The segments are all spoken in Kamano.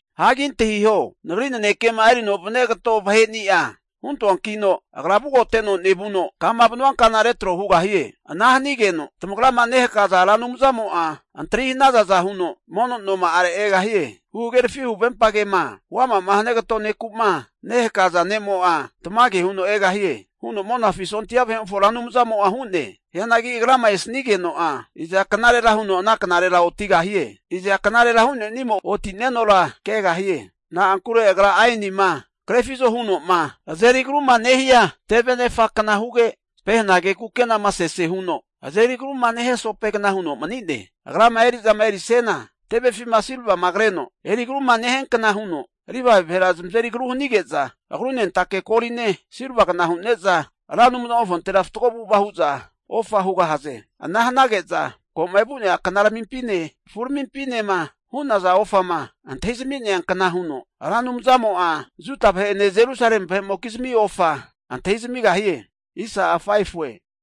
Hagi antahiho, Nagri nanekema erino vania kato vaheni'a huntoankino agra vugoteno nevuno, kama vanua kana retro hugahie. Ana hanigeno, tamagrama nehakaza Ra Anumzamo'a antri hanazaza huno mono noma'are egahie. Huhagerafi huvempagema huama'ma hania kato neku'ma nehakaza ne'mo'a tamage huno egahie, huno Monafi sondia vahe'mofo Ra Anumzamo'a hu'ne. Hianagi Agrama esanigeno'a, iza knarera huno ana knarera otigahie? Iza knarera hu'nenimo oti'nenora kegahie? Na'ankure Agra aenima krefizo huno'ma azeri agruma nehia teve nefakna huge, pehenage kukenama sese huno azeri agruma nehia sopegna huno mani'ne. Agrama eri'zama erisiana, tevefima silvama kreno eri agruma nehiankna huno, Livae vahera zamazeri agru hanige'za, agrunentake goline silvagna hu'ne'za Ra Anumzamofontera fatgo avu'ava hu'za ofa hugahaze. Ana hanage'za, ko'ma evu'nea knaramimpine kafuramimpinema hu'naza ofama antahizami'nea kna huno Ra Anumzamo'a Juda vahe'ene Jerusalemi vahe'mokizmi ofa antahi zamigahie.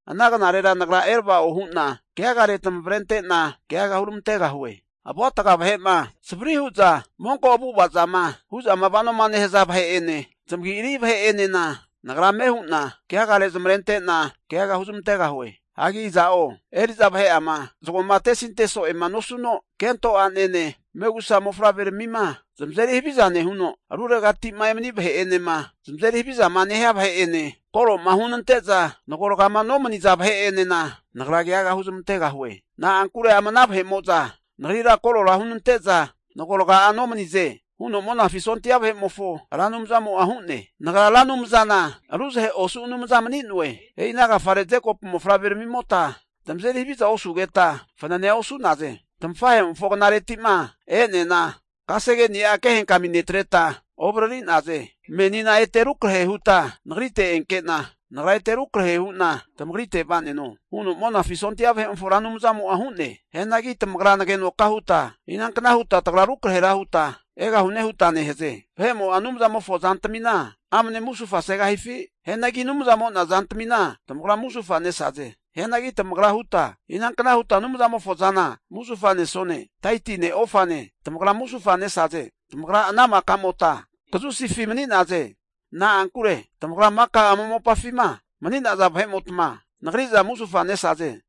Ana knarera Nagra erava'o hu'na keagare tamavrente'na keaga huramantegahue. Avuatga vahe'ene savri hu'za monko avu'avazama hu'zama vanoma nehaza vahe'ene, zamagi'ari vahe'enena Nagra ame hu'na keagare zamavarente'na keaga huzmantegahue. Hagi iza'o eri'za vahe'ama zagoma atesinte so'ema nosuno, kento a'nene, megusa mofavreramima zamazeri haviza nehuno, ruregati'ma emani vahe'enema zamazeri havizama nehia vahe'ene koroma hunante'za nagorgama nomaniza vahe'enena Nagra keaga huzmantegahue. Na'ankure ama ana vahe'mo'za Nagrira korora hunante'za nagoraga'a nomanize, huno Monafi sondia vahe'mofo Ra Anumzamo'a hu'ne. Nagra Ra Anumzana ruzahe osu Anumza mani'noe. E'ina agafare Jekopu mofavreramimota tamazeri haviza osugeta fananea osu'naze. Tamafahe'mofo knareti'ma e'neana, kasegeni'a kehenkami netreta ovariri'naze. Menina ete rukrahe huta nagrite enkena, Nagra ete rukrahe huna tamagrite vaneno, huno Monafi sondia vahe'mofo Ra Anumzamo'a hu'ne. Hianagi tamagra nagenoka huta, inankna huta tagra rukrahera huta egahune? huta nehaze. Vahe'mo'a Anumzamofo zantamina amane musufa segahifi? Hianagi Anumzamo'na zantamina tamagra musufa nesaze. Hianagi tamagra huta, inankna huta Anumzamofo zana musufa nesone? Taitine ofane tamagra musufa nesaze. Tamagra ana maka'mota kazusifi mani'naze, na'ankure tamagra maka ama mopafima mani'naza vahe'mota Nagri'za musufa nesaze.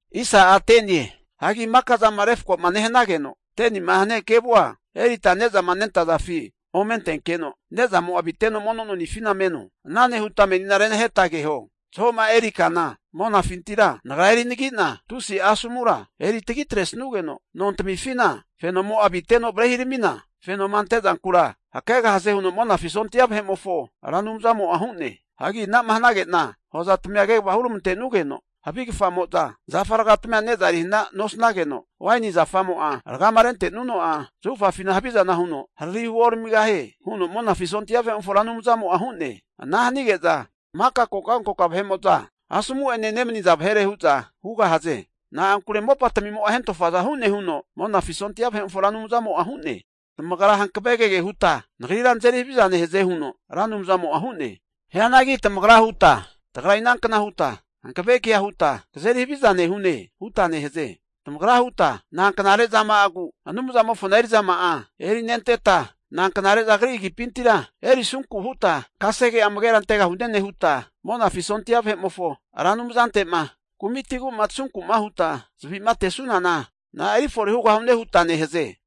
Hagi maka'zama refkoma nehanageno 10ni'ma hania kevua erita ne'zama nentazafi ome antenkeno nezamo'a aviteno mono nonifina meno. Ana nehuta menina renaheta keho, zahoma eri kana monafintira Nagra eri anagi'na tusi'a asomura eri tagitresugeno nontamifina fenomo'ma aviteno varehiramina fenoma ante kankamunkura hakegahaze huno Monafi sondia vahe'mofo Ra Anumzamo'a hu'ne. Hagi anama hanage'na hozatamia kegava huramante'nugeno havi kafamo'za zafa ragatamia neza eri hana nosanageno, waini zafamo'a ragama rente'nuno'a zahufafina havizana huno hariri huoramigahie, huno Monafi sondia vahe'mofo Ra Anumzamo'a hu'ne. Ana hanige'za maka kokankoka vahe'mo'za asomu'ene nemaniza vahere hu'za hugahaze. Na'ankure mopatmimo'a hentofaza hu'ne huno Monafi sondia vahe'mofo Ra Anumzamo'a hu'ne. Tamagra hankave kege huta Nagrira nazeri haviza nehaze huno Ra Anumzamo'a hu'ne. Hianagi tamagra huta, tagra inankna huta hankave kea huta kazeri haviza nehune? huta nehaze. Tamagra huta, nanknare zama'agu Anumzamofona eri'zama'a erinenteta, nanknare'za agripintira erisunku huta kasege'a amagera antegahune nehuta, Monafi sondia vahe'mofo Ra Anumzante'ma kumitigu'ma tasunku huta zavi'matesunana na'a eri fore hugahune? huta nehaze.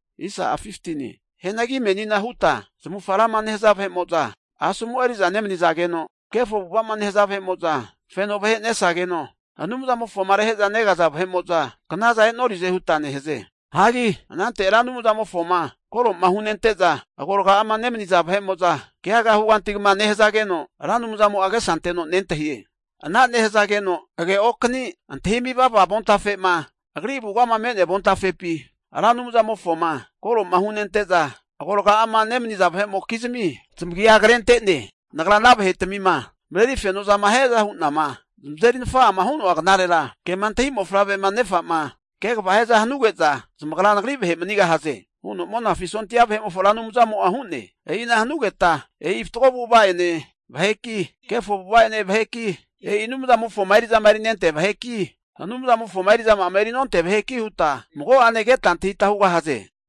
Hianagi menina huta, zamavufaga rama nehaza vahe'mo'za asomu eri'za nemanizageno, kefo avu'ava zama nehaza vahe'mo'za feno vahe nesazageno, Anumzamofoma rehe'za negaza vahe'mo'za knazana e'norize huta nehaze. Hagi anante Ra Anumzamofoma koro'ma hunente'za agoraga'ama nemaniza vahe'mo'za keaga huganti kama nehazageno, Ra Anumzamo'a agesa anteno nentahie. Ana nehazageno age'okani antahimi vava avontafema Agri avugama me'nea avontafepi, Ra Anumzamofoma koroma hunente'za, agoraga'ama nemaniza vahe'mokizmi zamagia krente'ne. Nagra ana vahetmima mareri fenozama hiaza hu'nama zamazeri nafa'ama hanua knarera, kema antahi mofavrema nefa'ma kegava hiaza hanuge'za, zamagra nagri vahe manigahaze, huno Monafi sondia vahe'mofo Ra Anumzamo'a hu'ne. E'ina hanugeta, e'i fatgo avu'ava'ene vaheki, kefo avu'ava'ene vaheki, e'i Anumzamofoma eri'zama erinentea vaheki, Anumzamofoma eri'zama'ama eri nontea vaheki huta mago'ane keta antahita hugahaze.